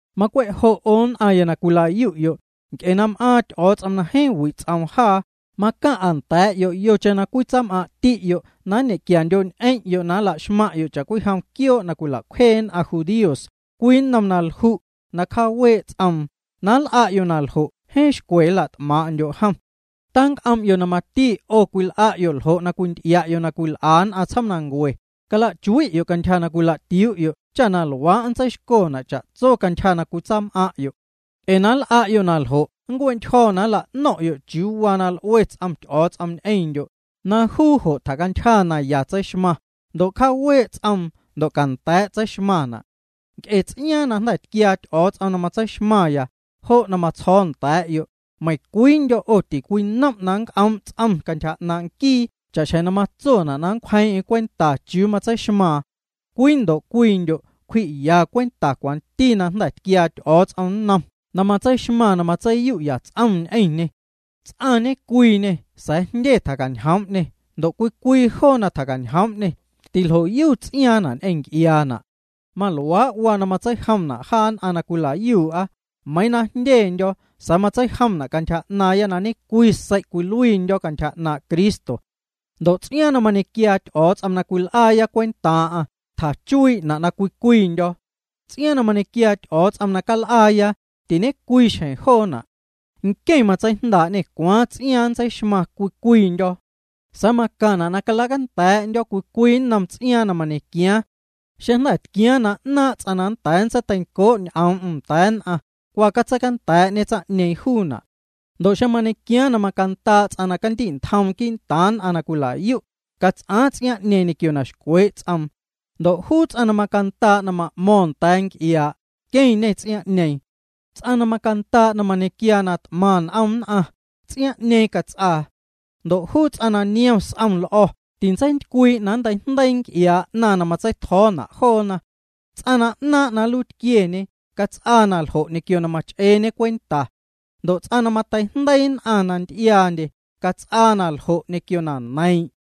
Macwe' jo' 'o nn'aⁿya na cwila'yu'yo', nc'e na m'aaⁿ Ty'o̱o̱ts'om na jeeⁿ wi' ts'oom jaa, macaⁿ'a nda̱a̱'yo' yocheⁿ na cwitsaam'aⁿti'yo' na nñequiandyo'ñ'eⁿ'yo' na nla'xmaⁿ'yo' cha'cwijom quioo' na cwila'cwjee nn'aⁿ judíos, cwii nnom na lju', na cjaawee' ts'oom. Na nl'a'yo' na ljo' jeeⁿ xcwe nla't'maaⁿ'ndyo' jom. Tanc'om'yo' na mati 'o cwil'a'yo' ljo' na cwinty'ia'yo' na cwil'a nn'aⁿ tsjoomnancue, cala'chui'yo' cantyja na cwila'tiuu'yo' cha na luaa' ntseixcona' cha'tso cantyja na cwitsaam'aⁿ'yo'. Ee na nl'a'yo' naljo' nncue'ntyjo̱ na nla'no̱ⁿ'yo' chiuu waa na l'ue ts'om Ty'o̱o̱ts'om ñ'eⁿndyo', na juu jo' tjacantyja naya tseixmaⁿ, ndo' cjaawee' ts'oom ndo' canda̱a̱' tseixmaⁿna'. Nc'e ts'iaaⁿ na jnda̱ tquiaa Ty'o̱o̱ts'om na matseixmaⁿya, jo' na matsjo̱o̱ya nda̱a̱'yo', meiⁿcwiindyo' 'o tincwinom' na nnc'oom' ts'om cantyja 'naaⁿ' nquii cha'xjeⁿ na matsona' na nncwjeiiⁿ'eⁿ cwenta chiuu matseixmaaⁿ. Cwii ndo' cwiindyo' cwji'ya cwenta cwanti na jnda̱ tquiaa Ty'o̱o̱ts'om nnom na matseixmaⁿ na matseiyu'ya ts'om ñ'eⁿñê. Ts'aⁿ ñecwiiñê sa̱a̱ jndye tjaacañjoom'ñê, ndo' cwii cwii joo na tjacañjoom'ñê tiljo'yu ts'iaaⁿ'na' ñ'eⁿ nc'iaana'. Maluaa' waa na matseijomna' jaa nn'aⁿ na cwila'yuu'a, meiiⁿ na jndyendyo̱ sa̱a̱ matseijoom'na' cantyja 'naaⁿya na ñe'cwii sei' cwiluiindyo̱ cantyja 'naaⁿ' Cristo. Ndo' ts'iaaⁿ na mañequiaa Ty'o̱o̱ts'om na cal'aaya cwentaaⁿ'aⁿ tjachuii'na' na cwii cwiindyo̱. Ts'iaaⁿ na mañequiaa Ty'o̱o̱ts'om na cal'aaya, tiñecwii xjeⁿ joona'. Nqueⁿ matseijndaa'ñê cwaaⁿ ts'iaaⁿ nntseixmaⁿ cwii cwiindyo̱. Sa̱a̱ macaⁿna' na calacanda̱a̱'ndyo̱ cwii cwii nnom ts'iaaⁿ na mañequiaaⁿ. Xeⁿ na jnda̱ tquiaaⁿ na 'naaⁿ' ts'aⁿ na nnda̱a̱ nntseiteincoo' ñ'oom'm nda̱a̱ nn'aⁿ, cwa catseicanda̱a̱'ñe tsaⁿ'ñeeⁿ juuna'. Ndo' xeⁿ mañequiaaⁿ na macandaa' ts'aⁿ na candi'ntjom quii'ntaaⁿ nn'aⁿ na cwila'yu', cats'aa ts'iaaⁿ'ñeeⁿ ñequio na xcwee' ts'om. Ndo' juu ts'aⁿ na macandaa' na ma'mo̱ⁿ nda̱a̱ nc'iaa', queⁿñe ts'iaaⁿ'ñeeⁿ. Ts'aⁿ na macandaa' na mañequiaa na t'maⁿ n'om nn'aⁿ, ts'iaaⁿ'ñeeⁿ cats'aa. Ndo' juu ts'aⁿ na niom s'om l'o̱ tintseintycwii' na nnteijndeii nc'iaa' 'naⁿ na matsei'tjo̱o̱na' joona. Ts'aⁿ na 'naaⁿ' na nluiitquieñe cats'aa naljo' ñequio na mach'eeñe cwenta. Ndo' ts'aⁿ na mateijndeii nn'aⁿ na nty'iaandye cats'aa naljo' ñequio na neiiⁿ'.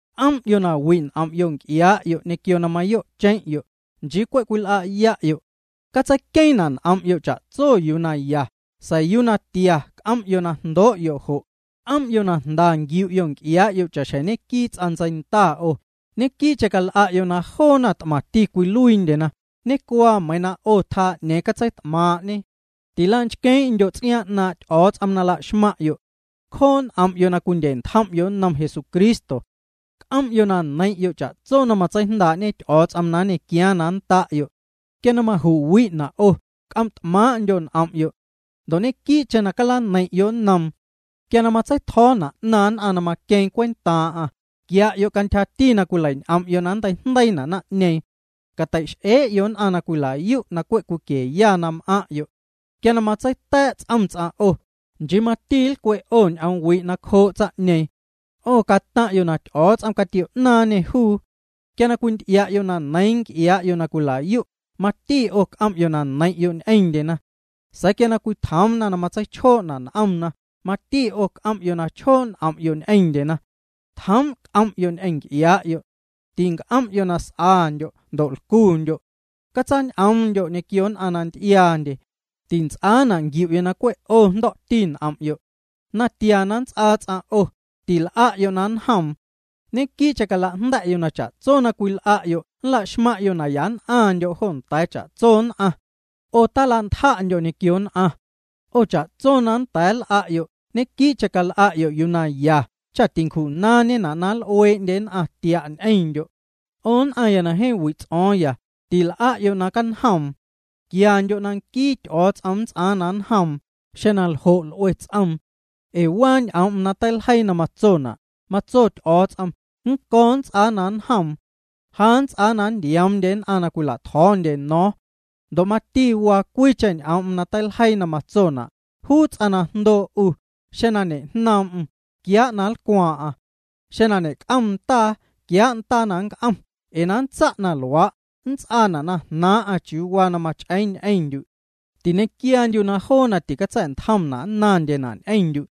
C'om'yo' na wi' n'om'yo' nc'iaa'yo' ñequio na mayo'cheⁿ'yo', nchii cwe' cwil'a'ya'yo'. Catseiqueeⁿna' n'om'yo' cha'tso yuu na ya, sa̱a̱ yuu na tia c'om'yo' na jndoo'yo'. C'om'yo' na jnda nquiu'yo' nc'iaa'yo' cha'xjeⁿ ñeⁿnquii ts'aⁿ ntseinda 'o, ñequii'cheⁿ cal'a'yo' na joona t'maⁿti caluiindye, ñecuaa meiiⁿ 'o tjaa 'ñeeⁿ catseit'maaⁿ'ñe. Tila'nchqueeⁿ'ndyo' ts'iaaⁿ 'naaⁿ' Ty'o̱o̱ts'om na la'xmaⁿ'yo'. Cjoo' n'om'yo' na cwindye'ntjom'yo' nnom Jesucristo. C'om'yo' na neiⁿ'yo' cha'tso na matseijndaa'ñe Ty'o̱o̱ts'om na nñequiaaⁿ na nnda'yo'. Quia maju'wi'na' 'o, c'om't'maaⁿ'ndyo' n'om'yo'. Ndo' ñequii'cheⁿ calaneiⁿ'yo' nnoom. Quia matseitjo̱o̱na' 'naⁿ nn'aⁿ na maqueeⁿ cwentaaⁿ'aⁿ, quia'yo' cantyja na cwileiñ'om'yo' na nnteijndeiina' naⁿ'ñeeⁿ. Catei'x'ee'yo' nn'aⁿ na cwila'yu' na cwe' cwiquieya na m'aⁿ'yo'. Quia matseita̱a̱' ts'om ts'aⁿ 'o, nchii mati nlcwe' 'o ñ'oom wi' cjoo' tsaⁿ'ñeeⁿ. 'O cataⁿ'yo' na Ty'o̱o̱ts'om catio'naaⁿñê juu. Quia cwinty'ia'yo' na neiiⁿ nc'iaa'yo' na cwila'yu', mati 'o c'om'yo' na neiⁿ'yo' ñ'eⁿndyena. Sa̱a̱ quia cwitjoomna na matseichjoo'na' n'omna, mati 'o c'om'yo' na chjoo' n'om'yo' ñ'eⁿndyena. Tjoom' c'om'yo' ñ'eⁿ nc'iaa'yo'. Tinc'om'yo' na s'andyo' ndo' lcundyo'. Catsañ'oomndyo' ñequio nn'aⁿ na nty'iaandye, tints'aana' nquiu'yo' na cwe' 'o jndo̱'ti n'om'yo'. Natia na nnts'aa ts'aⁿ 'o, til'a'yo' na nnjoom. Ñequii'cheⁿ cala'jnda̱'yo' na cha'tso na cwil'a'yo' nla'xmaⁿ'yo' na ya nn'aⁿndyo' jo nda̱a̱ cha'tso nn'aⁿ. 'O tacala'ntja'ndyo' ñequio nn'aⁿ. 'O cha'tso na nnda̱a̱ nl'a'yo' ñequii'cheⁿ cal'a'yo' yuu na ya cha tincju'naaⁿñena' na nl'uee'ndye nn'aⁿ tia' ñ'eⁿndyo'. 'O nn'aⁿya na jeeⁿ wi' ts'o̱o̱ⁿya, til'a'yo' na canjoom. Quiandyo' na nquii Ty'o̱o̱ts'om nnts'aaⁿ na nnjoom, xeⁿ naljo' l'ue ts'oom. Ee waa ñ'oom'm na teiljeii na matsona': “Matso Ty'o̱o̱ts'om: Nnco̱ nnts'aa na nnjoom. Ja nnts'aa na nntioomndye nn'aⁿ na cwila'tjo̱o̱ndye no̱o̱ⁿ.” Ndo' mati waa cwiicheⁿ ñ'oom na teiljeii na matsona': “Juu ts'aⁿ na jndoo' 'u, xeⁿ na ñejnoom'm, quiaa' na nlcwaaⁿ'aⁿ. Xeⁿ na ñec'om ndaa, quiaa' ndaa na nnc'om ee na nntsa' na luaa', nnts'aana' na jnaaⁿ'aⁿ chiuu waa na mach'eeⁿ ñ'eⁿndyu'.” Tiñe'quiaandyu' na joo na ticatsa̱'ntjomna' nnaⁿndyena' ñ'eⁿndyu'.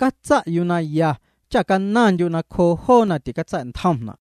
Catsa' yuu na ya cha canaⁿndyu' nacjoo' joo na ticatsa̱'ntjomna'.